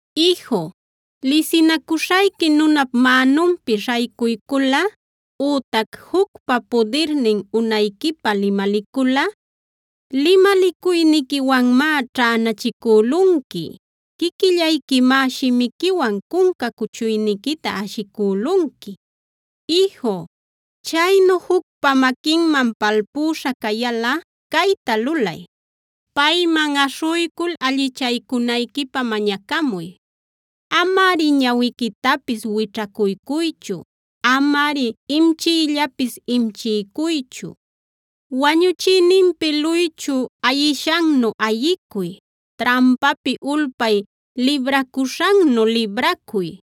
Iju, lisinacuśhayqui nunap mänunpi śhaycuyculꞌa ütac jucpa pudirnin unayquipä limaliculꞌa, limalicuyniquiwanmá ćhänachicülunqui, quiquillayquimá shimiquiwan cunca cuchuyniquita ashicülunqui. Iju, chaynu jucpa maquinman palpüśha cayalꞌa cayta lulay: Payman uyshuycul allichaycunayquipä mañacamuy. Amari ñawiquitapis wićhaycuychu; amari imchiyllapis imchiycuychu. Wañuchïninpi luychu ayishannu ayicuy; trampapi ulpay libracuśhannu libracuy.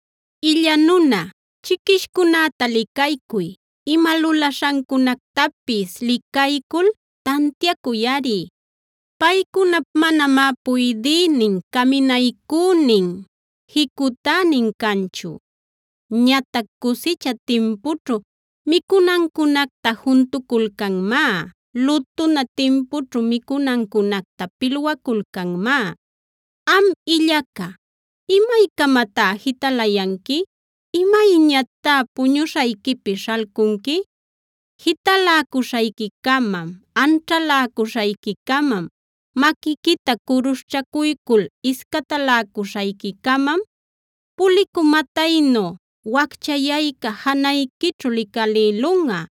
Illa nuna, chiquishcunäta licaycuy; ima lulaśhancunactapis licaycul tantiacuyꞌari. Paycunap manamá puydïnin, caminaycünin, jicutänin canchu. Ñatac cusicha timpućhu micunancunacta juntuculcanmá; lutuna timpućhu micunancunacta pilwaculcanmá. Am illaca, ¿imaycamatá jitalayanqui? ¿Imayñatá puñuśhayquipi śhalcunqui? Jitaläcuśhayquicamam, anćhaläcuśhayquicamam, maquiquita curuśhchacuycul iscataläcuśhayquicamam, pulicü mataynu wacchayayca janayquićhu licalïlunꞌa,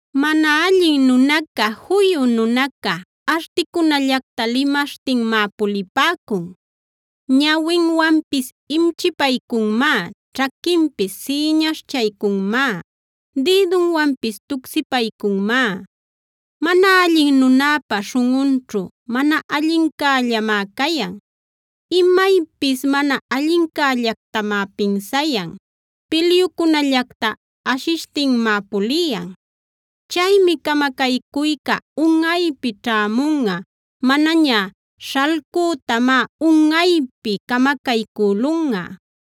Mana allin nunaca, juyu nunaca articunallacta limaśhtinmá pulipäcun. Ñawinwanpis imchipaycunmá, ćhaquinpis sïñaśhchaycunmá, dïdunwanpis tucsipaycunmá. Mana allin nunäpa śhunꞌunćhu mana allincällamá cayan; imaypis mana allincällactamá pinsayan, pilyucunallacta ashishtinmá puliyan. Chaymi camacaycuyca unꞌaypi ćhämunꞌa; manaña śhalcütamá unꞌaypi camacaycülunꞌa.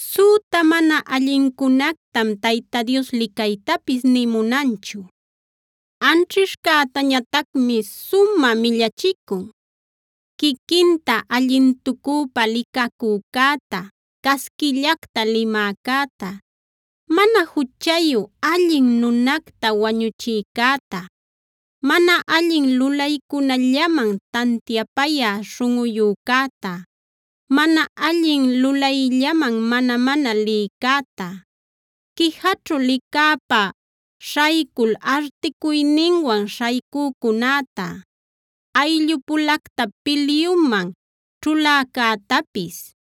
Süta mana allincunactam Tayta Dios licaytapis nï munanchu; anćhishcätañatacmi sumä millachicun: Quiquinta allintucüpa licacücäta, casquillacta limäcäta, mana juchayu allin nunacta wañuchïcäta, mana allin lulaycunallaman tantiapayä śhunꞌuyücäta, mana allin lulayllaman mana-mana lïcäta, quijaćhu licäpa śhaycul articuyninwan śhaycücunäta, ayllupulacta pilyuman ćhuläcätapis.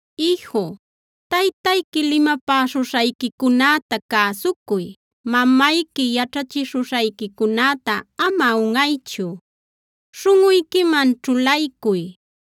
Iju, taytayqui limapäśhuśhayquicunäta cäsucuy; mamayqui yaćhachishuśhayquicunäta ama unꞌaychu. Śhunꞌuyquiman ćhulaycuy;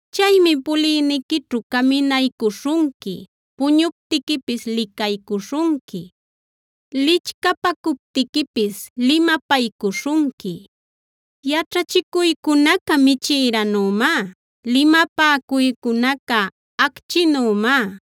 Chaymi puliyniquićhu caminaycuśhunqui; puñuptiquipis licaycuśhunqui; lichcapacuptiquipis limapaycuśhunqui. Yaćhachicuycunaca michïranümá, limapäcuycunaca acchinümá;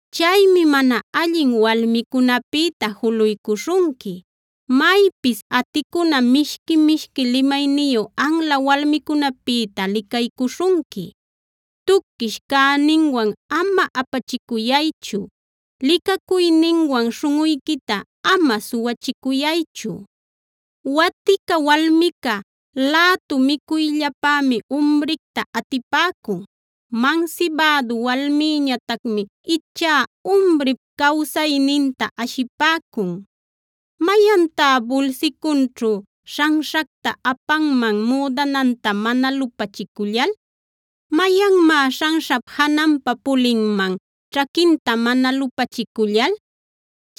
Chaymi mana allin walmicunäpïta juluycuśhunqui, maypis aticuna mishqui-mishqui limayniyu anla walmicunäpïta licaycuśhunqui. Tuquish cayninwan ama apachicuyaychu; licacuyninwan śhunꞌuyquita ama suwachicuyaychu. Waticad walmica lätu micuyllapämi umricta atipäcun; mansibädu walmïñatacmi ichá umrip cawsayninta ashipäcun. ¿Mayantá bulsicunćhu śhanśhacta apanman müdananta mana lupachicullal? ¿Mayanmá śhanśhap jananpa pulinman ćhaquinta mana lupachicullal?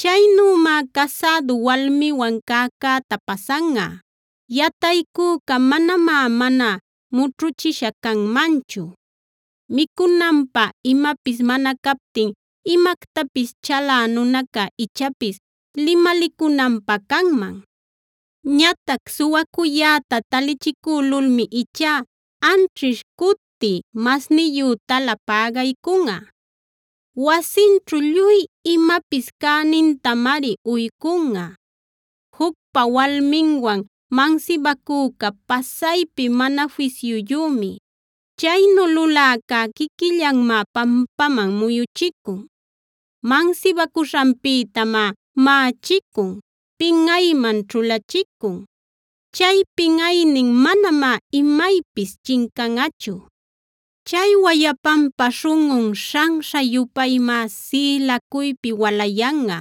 Chaynümá casädu walmiwan cäcäta pasanꞌa; yataycüca manamá mana mućhuchisha canmanchu. Micunanpä imapis mana captin imactapis chalä nunaca ichapis limalicunanpä canman. Ñatac suwacuyäta talichicülulmi ichá anćhish cuti masniyütala pägaycunꞌa; wasinćhu lluy imapis cänintamari uycunꞌa. Jucpa walminwan mansibacücá pasaypi mana fisyuyümi; chaynu luläcá quiquillanmá pampaman muyuchicun. Mansibacuśhanpïtamá maꞌachicun, pinꞌayman ćhulachicun; chay pinꞌaynin manamá imaypis chincanꞌachu. Chay wayapanpa śhunꞌun śhanśha-yupaymá sïlacuypi walayanꞌa;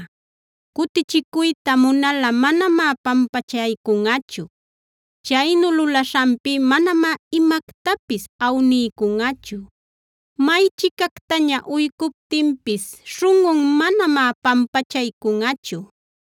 cutichicuyta munal manamá pampachaycunꞌachu. Chaynu lulaśhanpi manamá imactapis awniycunꞌachu; maychicactaña uycuptinpis śhunꞌun manamá pampachaycunꞌachu.